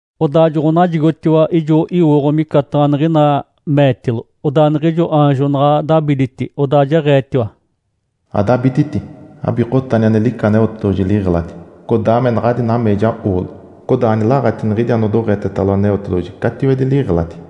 Odaa joɡ̶onajigotiwa ijo iwooɡ̶o micataɡ̶a niɡ̶ina meetilo. Odaa niɡ̶ijo aanjo naɡ̶a dabiditi odaa jeɡ̶eetiwa, “Adabititi, abikotani ane lica Aneotedoɡ̶oji liɡ̶eladi, codaa me naɡ̶adi nameeja oolo, codaa anilaɡ̶ati niɡ̶idi anodoɡ̶etetalo Aneotedoɡ̶oji catiwedi liɡ̶eladi.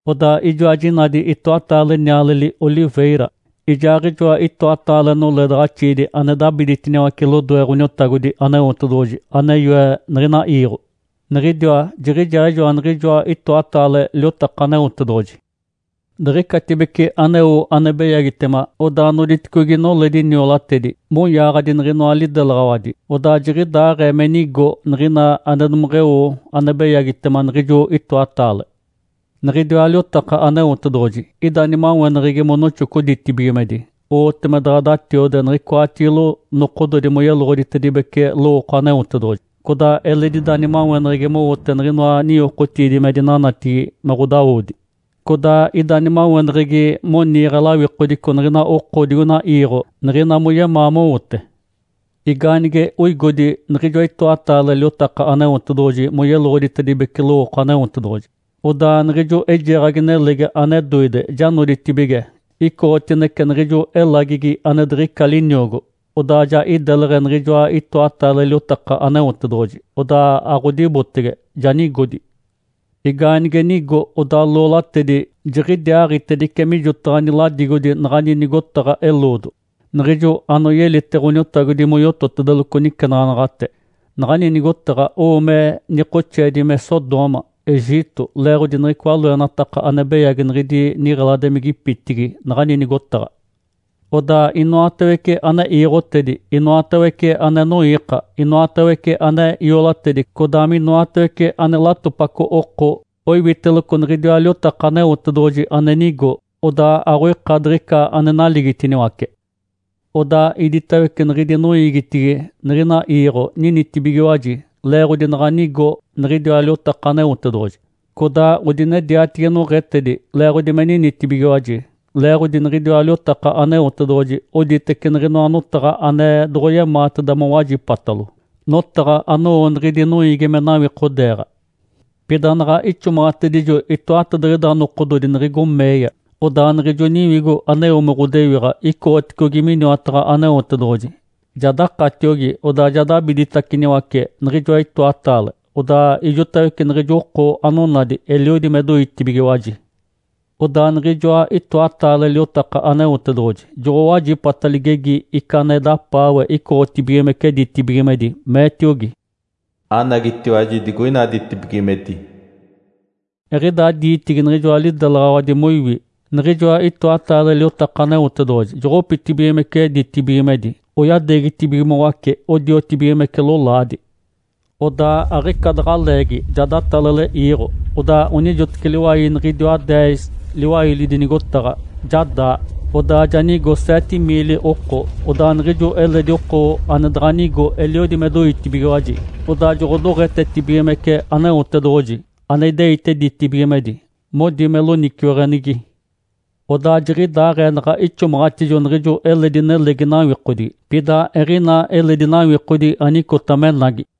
Odaa ijoa jinadi itoataale nialeli “oliveira” ijaaɡ̶ijoa itoataale noledaɡ̶axiidi ane dabiditiniwace lodoe Ǥoniotagodi Aneotedoɡ̶oji ane yoe niɡ̶ina iiɡ̶o, niɡ̶idiwa jiɡ̶ijaaɡ̶ijoa niɡ̶ijoa itoataale liotaka Aneotedoɡ̶oji. Diɡ̶icatibece aneo ane beyagitema, odaa noditicogi noledi niolatedi moyaaɡ̶adi niɡ̶inoa lidelaɡ̶awadi. Odaa jiɡ̶idaaɡ̶ee me nigo niɡ̶ina ane domeɡ̶eo ane beyagitema niɡ̶ijo itoataale. Niɡ̶idiwa liotaka Aneotedoɡ̶oji ida nimaweneɡ̶egi monoxoco ditibigimedi, owote me daɡ̶a datiode niɡ̶icoatigilo nokododi moyeloɡ̶oditedibece lowooko Aneotedoɡ̶oji. Codaa eledi ida nimaweneɡ̶egi mowote niɡ̶inoa ninyokotiidi me dinanatigi me ɡ̶odawodi. Codaa ida nimaweneɡ̶egi moniiɡ̶e lawikodico niɡ̶ina oko digoina iiɡ̶o, niɡ̶ina moyemaa mowote. Igaanige oigodi niɡ̶ijoa itoataale liotaka Aneotedoɡ̶oji moyeloɡ̶oditedibece lowooko Aneotedoɡ̶oji, odaa niɡ̶ijo eijeeɡ̶agi nelegi ane doide ja noditibige icoɡ̶otinece niɡ̶ijo elagigi ane diɡ̶ica liniogo. Odaa ja ideleɡ̶e niɡ̶ijoa itoataale liotaka Aneotedoɡ̶oji, odaa aɡ̶odibotege, ja nigodi. Igaanige nigo, odaa loolatedi jiɡ̶idiaaɡ̶itedice mijotaɡ̶a niladigodi naɡ̶ani nigotaɡ̶a eloodo, niɡ̶ijo anoyelite Ǥoniotagodi moyototedeloco nicenaɡ̶anaɡ̶ate. Naɡ̶ani nigotaɡ̶a owo me nikoxeedi me “Sodoma”, “Egito”. (Leeɡ̶odi niɡ̶icoa loenataka ane beyagi niɡ̶idi niɡ̶eladimigipitigi naɡ̶ani nigotaɡ̶a). Odaa inoatawece ane iiɡ̶otedi, inoatawece ane noiika, inoatawece ane iolatedi, codaa minoatawece ane latopaco oko, oiwiteloco niɡ̶idiwa liotaka Aneotedoɡ̶oji ane nigo, odaa aɡ̶oika diɡ̶ica ane naligitiniwace. Odaa iditawece niɡ̶idi noiigitigi niɡ̶ina iiɡ̶o ninitibigiwaji leeɡ̶odi naɡ̶a nigo niɡ̶idiwa liotaka Aneotedoɡ̶oji. Codaa odinediatigi noɡ̶etedi leeɡ̶odi me ninitibigiwaji. Leeɡ̶odi niɡ̶idiwa liotaka Aneotedoɡ̶oji oditece niɡ̶inoa notaɡ̶a ane doɡ̶oyemaateda mowajipatalo, notaɡ̶a anowo niɡ̶idi noiigi me nawikodeeɡ̶a. Pida naɡ̶a ixomaɡ̶atedijo itoatadiɡ̶ida nokododi niɡ̶igo meeya, odaa niɡ̶ijo Niwigo aneo me ɡ̶odewiɡ̶a icoɡ̶oticogi miniwataɡ̶a Aneotedoɡ̶oji, ja dakatiogi, odaa ja dabiditaciniwace niɡ̶ijoa itoataale. Odaa ijotawece niɡ̶ijo oko anonadi eliodi me doitibigiwaji. Odaa niɡ̶ijoa itoataale liotaka Aneotedoɡ̶oji joɡ̶owajipata ligegi ica ane dapaawe icoɡ̶otibigimece ditibigimedi, meetiogi, “Anagitiwaji digoina ditibigimedi!” Eɡ̶idaa diitigi niɡ̶ijoa lidelaɡ̶awadi moiwi, niɡ̶ijoa itoataale liotaka Aneotedoɡ̶oji joɡ̶opitibigimece ditibigimedi oyadeegitibigimoace odiotibigimece lolaadi. Odaa aɡ̶ica daɡ̶a leegi ja datalale iiɡ̶o. Odaa onijoteci liwai niɡ̶idiwa deez liwailidi nigotaɡ̶a ja daa. Odaa ja nigo seete miili oko. Odaa niɡ̶ijo eledi oko ane daɡ̶a nigo eliodi me doitibigiwaji, odaa joɡ̶odoɡ̶etetibigimece Aneotedoɡ̶oji ane ideite ditibigimedi, modi me loniciweɡ̶enigi. Odaa jiɡ̶idaaɡ̶ee naɡ̶a ixomaɡ̶atijo niɡ̶ijo eledi nelegi nawikodigi. Pida eɡ̶ina eledi nawikodigi anicota menagi.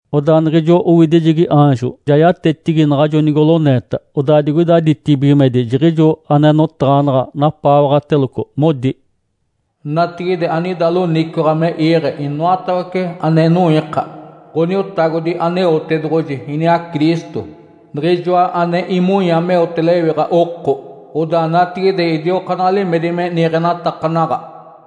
Odaa niɡ̶ijo owidijegi aanjo ja yatetigi naɡ̶ajo nigoloneeta. Odaa digoida ditibigimedi jiɡ̶ijo ane notaɡ̶anaɡ̶a napaawaɡ̶ateloco, modi, “Natigide anida loniciwaɡ̶a me iiɡ̶e inoatawece ane noiika, Ǥoniotagodi Aneotedoɡ̶oji iniaa Cristo, Niɡ̶ijoa ane imonya meote lewiɡ̶a oko. Odaa natigide idiokaanaɡ̶a limedi me niiɡ̶enatakanaɡ̶a.”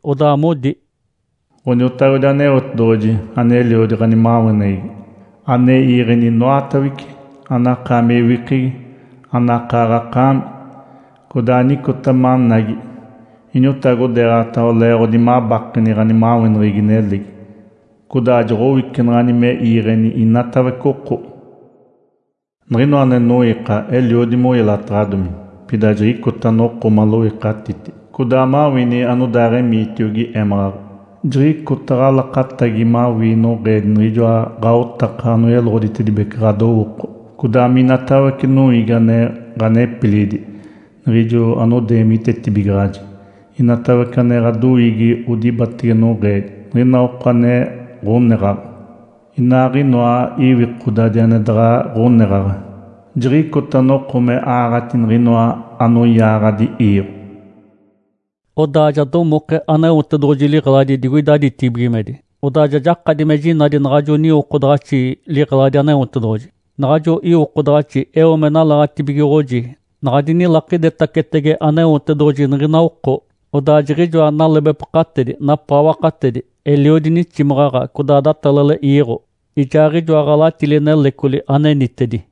Odaa modi, “Ǥoniotagodi Aneotedoɡ̶oji aneliodi ɡ̶animaweneɡ̶egi, ane iiɡ̶eni inoatawece, anakaami ewikegi, anakaaɡ̶akaami, codaa anicota managi, iniotagodeeɡ̶ataɡ̶awa leeɡ̶odi mabakeni ɡ̶animaweneɡ̶egi nelegi, codaa joɡ̶owicenaɡ̶ani me iiɡ̶eni inatawece oko. Niɡ̶inoa ane noiika eliodi moyelataɡ̶adomi, pida jiɡ̶icota noko maloikatiti, codaa mawini anodaaɡ̶emiitiogi émaɡ̶aɡ̶a. Jiɡ̶icota ɡ̶alakatagi mawii noɡ̶eedi niɡ̶ijoa ɡ̶aotaka anoyeloɡ̶oditedibece ɡ̶adowooko, codaa minatawece noiigi ane ɡ̶anepilidi, niɡ̶ijo anodeemitetibigaɡ̶aji. Inatawece ane ɡ̶adoiigi odibatege noɡ̶eedi, niɡ̶ina oko ane ɡ̶oneɡ̶aɡ̶a, inaaɡ̶inoa iwikodadi ane daɡ̶a ɡ̶oneɡ̶aɡ̶a. Jiɡ̶icota noko me aaɡ̶ati niɡ̶inoa anoyaaɡ̶adi iiɡ̶o.” Odaa ja domoke Aneotedoɡ̶oji liɡ̶eladi digoida ditibigimedi, odaa ja jakadi me jinadi naɡ̶ajo niwokodaɡ̶axi liɡ̶eladi Aneotedoɡ̶oji. Naɡ̶ajo iwokodaɡ̶axi eo me nalaɡ̶atibigoɡ̶oji naɡ̶a dinilakidetacetege Aneotedoɡ̶oji niɡ̶ina oko. Odaa jiɡ̶ijoa nalebepakatedi, napaawakatedi, eliodi niximaɡ̶aɡ̶a, codaa datalale iiɡ̶o, ijaaɡ̶ijoa ɡ̶alatili nelecoli anenitedi.